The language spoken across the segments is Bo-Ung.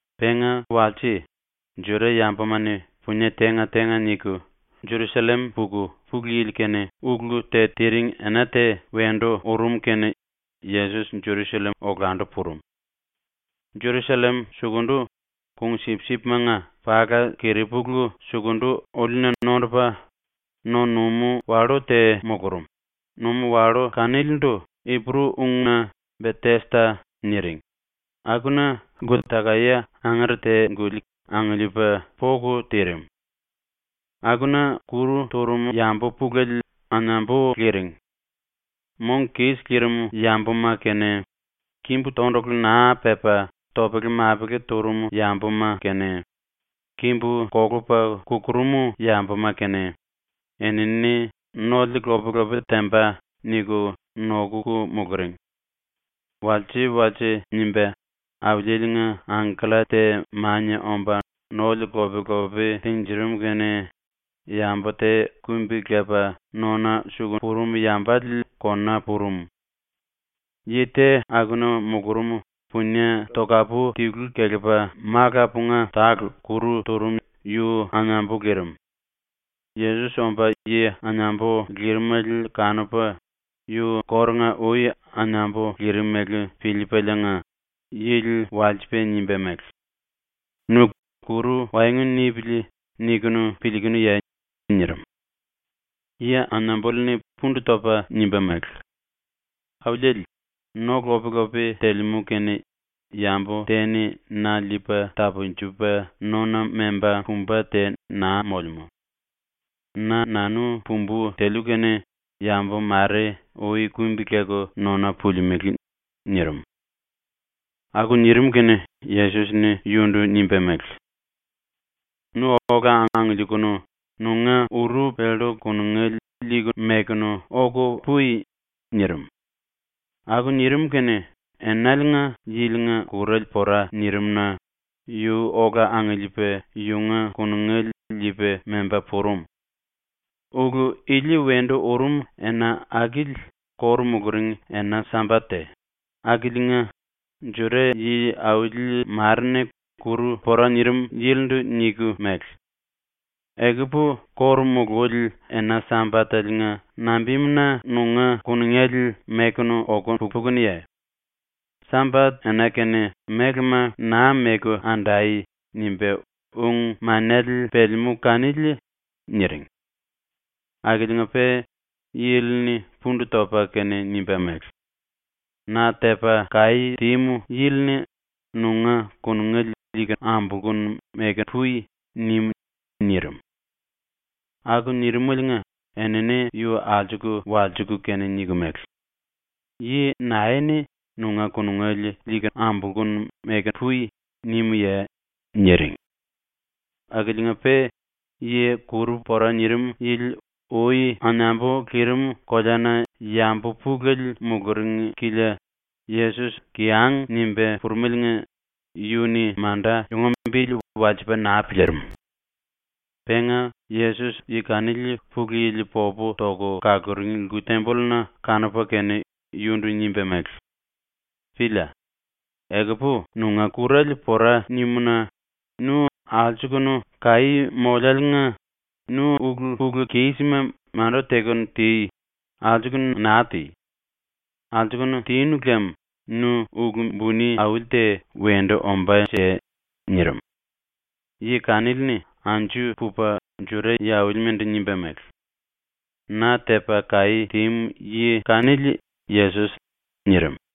Penga walse, Juda-yambuma-ni punie tenga-tenga niku Jerusallem puku Pulu Yili-kene ulu te tiring ena te wendu urum kene Yesos Jerusallem olandu purum. Jerusallem sukundu, kung-sipsipimanga pala-keripulu-sukundu-ólina nondupa, no-numú-wallú te mulurum, numú-wallú kanilindu Ipuru-ungna ‘Betesda’ niring, akuna lku-takae angere te-guli angiliipa poku tirim. Akuna kuru turum yambu pulele anambu liring. Mong kis lirim yambuma kene, kimbu tondulu naa pepa topele-mapele turum yambuma kene, kimbu kolupa kukurum yambuma kene, enini (‘Nole lop-lopi temba.’ niku nokuku muluring. Walse-walse nimba Auliele-nga angkella te mania omba nole lop-lopi tinjirim kene yambu te kumbi-lepa nona suku purum yambale kona purum.) Yi te akuna mulurum punie tokapu tilu kelepa malapunga tale kuru turum yu anambu lirim. Yesos omba, yi anambu lirimele kanupa, yu kórunga-ui anambu lirimele piliipaliinga, yili walsipa nimba mele: “Nu ‘kuru waengu nipili.’ niku piliikunuye?” nirim. Yi anambuli-ni pundu topa nimba mele: “Auliele, no lop-lopi telemú kene yambu te-ni na liipa tapunjupa nona memba pumba te naa molemú. Na-nanu pumbu teliu kene yambu mare ui kumbi-leku nona pulimelé.” nirim. Aku nirim kene Yesos-ni yundu nimba mele: “Nu ola angiliikunu nunga uru pellu kunungele liiku mekunu oku pui.” nirim. Aku nirim kene enaliinga yilinga kurale pora nirim-na yu ola angiliipa yunga kunungele liipa memba purum. Ulu ili wendu urum ena akili ⸤kóru muluring⸥ ena-Sambat te, akiliinga Juda yi-⸤auli⸥ mare-ni kuru pora nirim yilindu niku mele: “Ekupu ⸤kóru mululi⸥ ena-Sambatele-nga nambimuna nunga kunungele mekunu oku pukunuye? ‘Sambat-ena kene mélema naa meku andai.’ nimba ung-manele pelemú kanili.” niring. Akiliinga-pe yili-ni pundu topa kene nimba mele: “Na tepa kaí tímu yili-ni ‘Nunga kunungele liiku ambolkunu meku pui.’ nim.” nirim. Aku nirimaliinga enini yu alsuku walsiku kene niku mele: “Yi nae-ni ‘Nunga kunungele liiku ambolkunu meku pui.’ nimuye?” niring. Akiliinga-pe yi kuru pora nirim yili ui anambu lirim koleana yambu pulele muluring kilia Yesos kiyang nimba purumeliinga yu-ni manda yunga bili walsipa naa piliirim. Penga Yesos yi kanili ⸤Pulu Yili popu toku kaluring⸥ lku-tembolluna kanupa kene yundu nimba mele: “Pília. Ekupu nunga kurale pora nimu-na nu alsukunu kaí molláliinga nu ulu-pulu-kísima manda teku ti, alsukunu naa ti. Alsukunu tinu lem nu ulu buni auli te wendu ombánje.” nirim. Yi kanili-ni anju pupa Juda yi-aulimandu nimba mele: “Na tepa kaí tímu yi kanili Yesos.” nirim.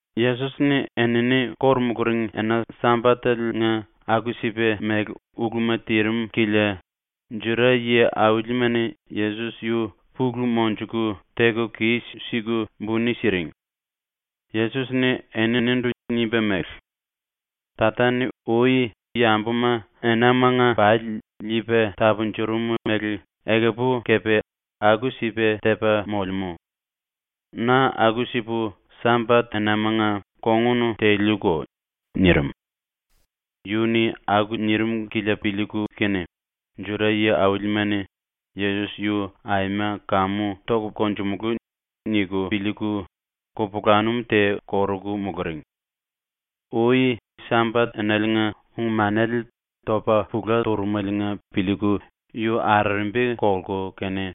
Yesos-ni enini kóru muluring ena Sambatele-nga aku-sipa mele uluma tirim kilia Juda yi-aulima-ni Yesos yu pulu monjuku teku kis-siku buni siring. Yesos-ni eninindu nimba mele: “Tata-ni ui yambuma enamanga pali liipa tapunjurum mele ekupu kepe aku-sipa tepa molemú. Na aku-sipu Sambat-enamanga kongun teliuko.” nirim. Yu-ni aku nirim kilia piliiku kene Juda yi-aulima-ni ‘Yesos yu aima kamu topu konjumulú.’ niku piliiku kupulanum te koruku muluring. Ui Sambat-enaliinga ung-manele topa pula turumeliinga piliiku yu arerembi kolku kene;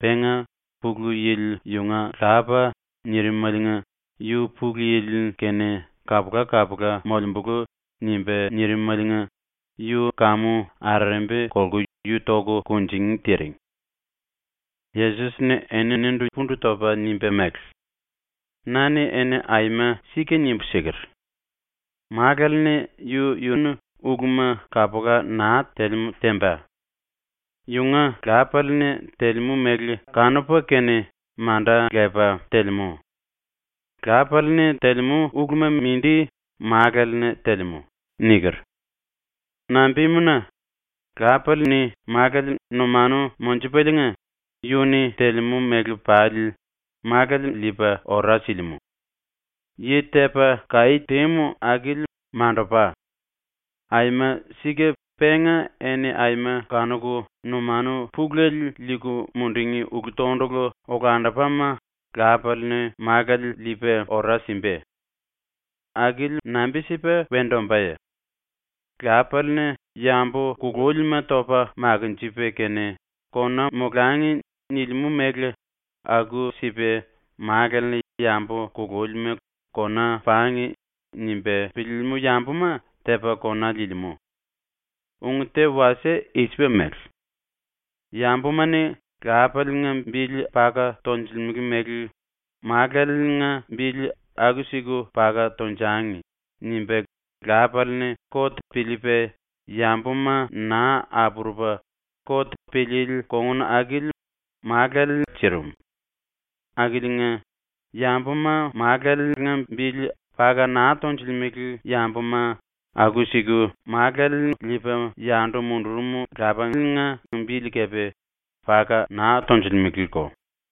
penga “Pulu Yili yunga lapa.” nirimaliinga yu ‘Pulu Yili-kene kapula-kapula molembulu.’ nimba nirimaliinga yu kamu arerembi kolku yu toku kunjingí tiring. Yesos-ni eninindu pundu topa nimba mele: “Na-ni eni aima sika nimbu siker: “Málale-ni yu-yunu uluma kapula naa telemú temba. Yunga Lapale-ni telemú mele kanupa kene manda lepa telemú. Lapale-ni telemú uluma mindi Málale-ni telemú.” niker. Nambimuna, Lapale-ni Málale numanu monjupaliinga yu-ni telemú mele pali Málale liipa ora silimú. Yi tepa kaí tímu akili mandupa. Aima sika penga eni aima kanuku numanu pulele liiku mundungí ulu-tondulu olandupama Lapale-ni Málale liipa ora simba. Akili nambi-sipa wendu ombáye? Lapale-ni yambu kulúlima topa makinjipa kene ‘Kona molangi.’ nilimú mele aku-sipa Málale-ni yambu kulúlima ‘Kona pangi.’ nimba piliilimú yambuma tepa kona liilimú. Ung te wasie i-sipa mele: ‘Yambuma-ni Lapale-nga bili paka tonjilimele mele Málenga bili aku-siku paka tonjangi.’ nimba Lapale-ni kot piliipa yambuma naa apurupa kot piliili kongun akili Málale sirim. Akiliinga, yambuma Málunga bili paka naa tonjilimele yambuma aku-siku Málu liipa yandu mundurum Lapanga bili kepe paka naa tonjilimeleko.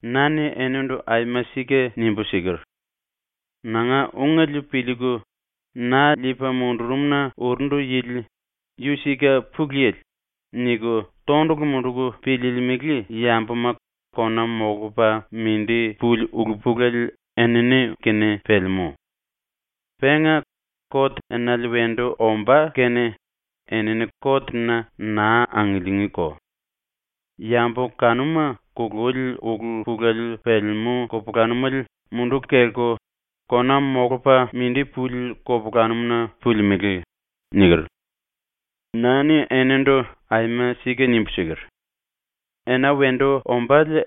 “Na-ni enindu aima sika nimbu siker: “Nanga ungele piliiku, na liipa mundurum-na urundu yili ‘Yu sika Pulu Yili.’ niku tondulu munduku piliilimili yambuma kona molupa mindi puli ulu-pulele enini-kene pelemú. Penga kot enale wendu ombá kene enini kot-na naa angiliingíko. Yambu kanuma kululi ulu-pulele pelemú kupulanumele munduku kelku kona molupa mindi puli kupulanum-na pulimelé.” niker. Na-ni enindu aima sika nimbu siker: “Ena wendu ombále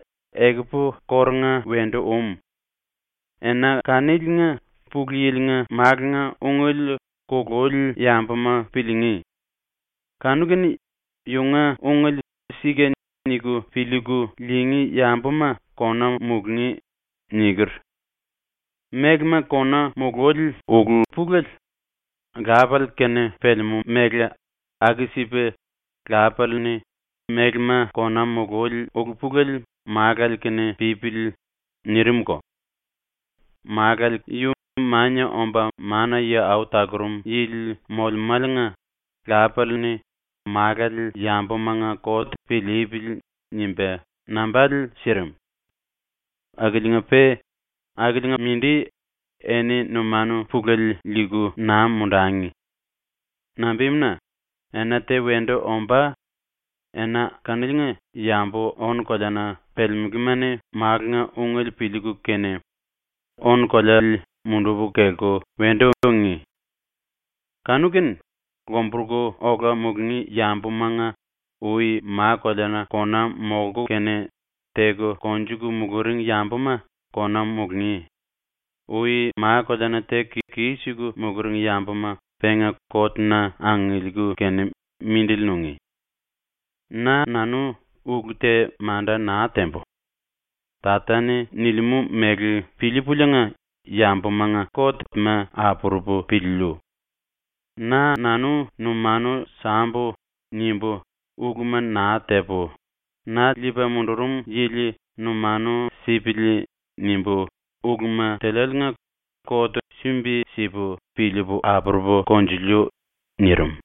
ekupu kórunga wendu um. Ena kaniliinga Pulu Yili-nga Málunga ungele kululi yambuma piliingí. Kanu-kene yunga ungele ‘Sika’ niku piliiku liingí yambuma kona mulungí.” niker. ⸤Mélema⸥ kona mululi ulu-pulele Lapale-kene pelemú mele aku-sipa Lapale-ni ‘⸤Mélema⸥ kona mululi ulu-pulele Málale-kene pípili.’ nirimko. Málale yu Mania Omba Mana-Yi Au Talurum Yili molemáliinga Lapale-ni ‘Málale yambumanga kot piliipili.’ nimba nambale sirim. “Akiliinga-pe akiliinga-mindi eni numanu pulele liiku naa mundangi. Nambimuna, ena te wendu ombá, ena kaniliinga yambu ónu-koleana pelemeléma-ni Málunga ungele piliiku kene, ónu-koleale munduku kelku wendu ungí. Kanu-kene lomburuku ola mulungí yambumanga ui ma-koleana kona molku kene teku konjuku muluring yambuma kona mulungí; ui ma-koleana teku kis-siku muluring yambuma penga kot-na angiliiku kene mindili nungí. “Na-nanu ulu te manda naa tembu. Tata-ni nilimú mele piliipuliinga yambumanga kot-ma apurupu piliiliu. ‘Na-nanu numanu sambu.’ nimbu uluma naa tepu, ‘Na liipa mundurum yili numanu sipili.’ nimbu uluma teliáliinga kot sumbi-sipu piliipu apurupu konjiliu.” ⸤nirim.⸥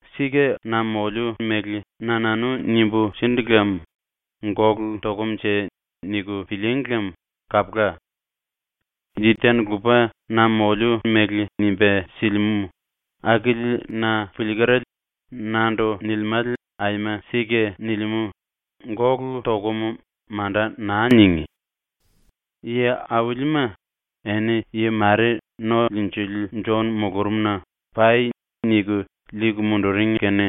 “Sika na moliu mele na-nanu nimbu sindu lem ‘Gólu tokumnje.’ niku pilííngi lem kapula. Yi te-ni lupa na moliu mele nimba silimú, akili na piliikerale nandu nilimále aima sika nilimú, ‘Gólu tokum.’ manda naa ningí. “⸤Yi-aulima,⸥ eni yi mare ⸤No-Liinjili⸥ Jon mulurumna “Pai.” niku liiku munduring kene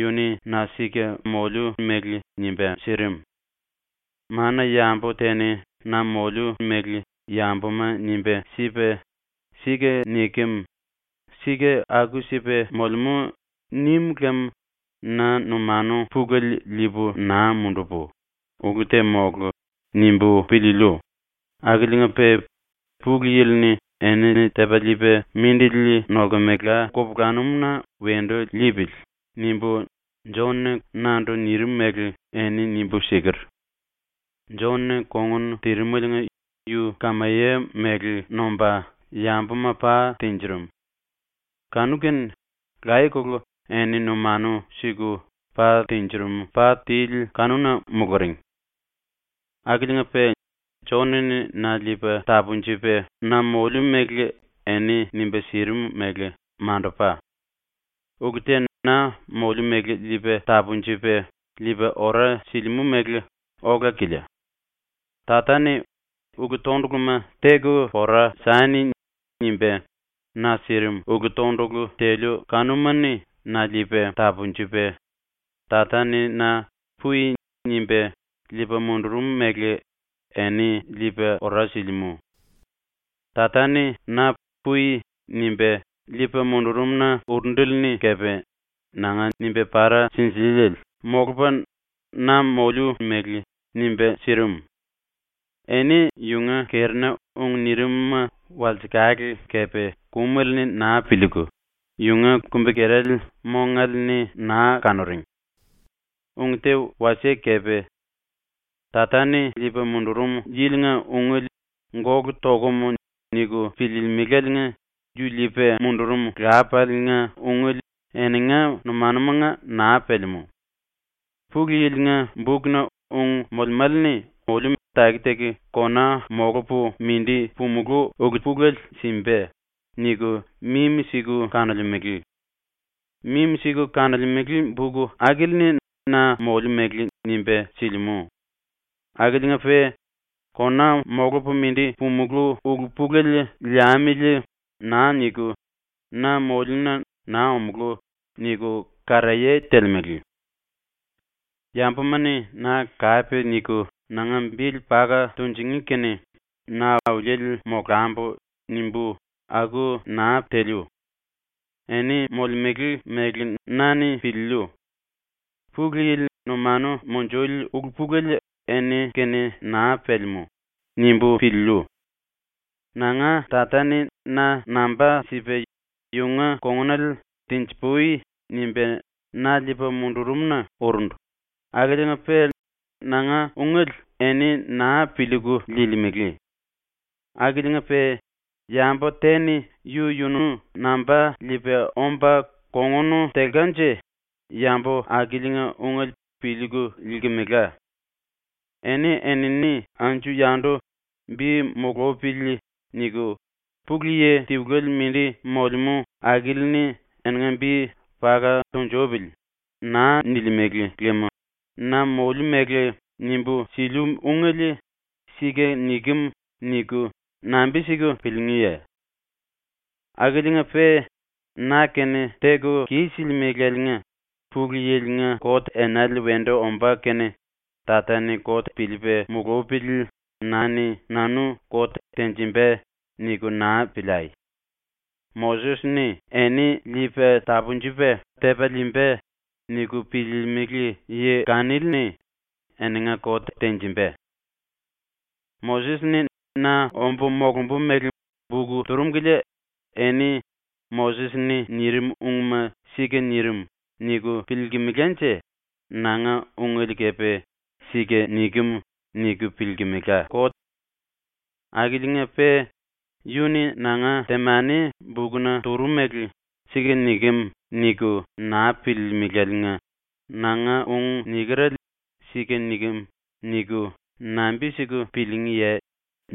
yu-ni na sika moliu mele nimba sirim. Mana-yambu te-ni na moliu mele yambuma nimba sipa “Sika nikem. Sika aku-sipa molemú.” nim lem na numanu pulele liipu naa mundupu, ‘Ulu te mólu.’ nimbu piliiliu, akiliinga-pe ‘Pulu Yili-ni enini tepa liipa mindili nolkemela kupulanum-na wendu liipili.’ nimbu Jon-ni nandu nirim mele eni nimbu siker. Jon-ni kongun tirimeliinga yu kamaye mele nomba yambuma pa tinjirim. Kanu-kene laye-kolo eni numanu siku pa tinjirim pa tili kanuna muluring. “Akiliinga-pe Jon-ni na liipa tapunjupa na moliu mele eni nimba sirim mele mandupa. Ulu te na moliu mele liipa tapunjupa liipa ora silimú mele ola-kilia. Tata-ni “Ulu-tonduluma teku pora sani.” nimba na sirim ulu-tondulu teliu kanuma-ni na liipa tapunjupa, Tata-ni na “Pui.” nimba liipa mundurum mele eni liipa ora silimú. Tata-ni na “Pui.” nimba liipa mundurum-na urundele-ni kepe nanga nimba para sinjiliele molupa na moliu mele nimba sirim. Eni yunga kerina ung nirim-ma walsekale kepe kumale-ni naa piliiku, yunga kumbi-kerale mongale-ni naa kanuring. Ung te wasie kepe. Tata-ni liipa mundurum yilinga ungele “Gólu tokum.” niku piliilimiláliinga yu liipa mundurum Lapale-nga ungele eninga numanumanga naa pelemú. ‘Pulu Yili-nga bukna ung molemále-ni oliu taki-taki kona molupu mindi pumulú ulu-pulele simba.’ niku mimi-siku kanolemele. Mimi-siku kanolemele buk akili-ni na moliu mele nimba silimú akiliinga-pe ‘Kona molupu mindi pumulú ulu-pulele liamili.’ naa niku, na moliuna ‘naa omulú.’ niku karaye telemele. “‘Yambuma-ni na kape niku nanga bili paka tunjingí kene na auliele molambu.’ nimbu aku naa teliu. Eni molemele mele na-ni piliiliu. ‘Pulu Yili numanu munjuli ulu-pulele eni-kene naa pelemú’ nimbu piliiliu. Nanga Tata-ni na namba sipa yunga kongunale ‘tenji-pui.’ nimba na liipa mundurum-na urundu akiliinga-pe nanga ungele eni naa piliiku liilimele. Akiliinga-pe yambu te-ni yu-yunu namba liipa omba kongun telkanje yambu akiliinga ungele piliiku liilkemela. Eni-enini anju-yandu ‘bi mulupili.’ niku, Pulu Yi tiluele mindi molemú akili-ni eninga bi ‘paka tunjupili.’ naa nilimele lem na moliu mele nimbu siliu ungele ‘Sika nikem.’ niku nambi-siku piliingíye? “Akiliinga-pe ⸤na-kene⸥ teku kis-silimelaliinga ‘Pulu Yili-nga kot enale wendu ombá kene Tata-ni kot piliipa mulupili na-ni nanu kot tenjimba.’ niku naa piliai. ‘Moses-ni eni liipa tapunjupa tepa liimba.’ niku piliilimili yi kanili-ni eninga kot tenjimba. Moses-ni na ombu molumbu mele buk turum kilia eni ‘Moses-ni nirim ungma sika nirim.’ niku piliilkimilanje nanga ungele kepe ‘Sika nikem.’ niku piliilkimilá. Akiliinga-pe yu-ni nanga temani bukna turumele ‘Sika nikem.’ niku naa piliilimiláliinga nanga ung nikerale ‘Sika nikem.’ niku nambi-siku piliingíye?”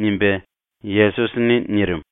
nimba Yesos-ni nirim.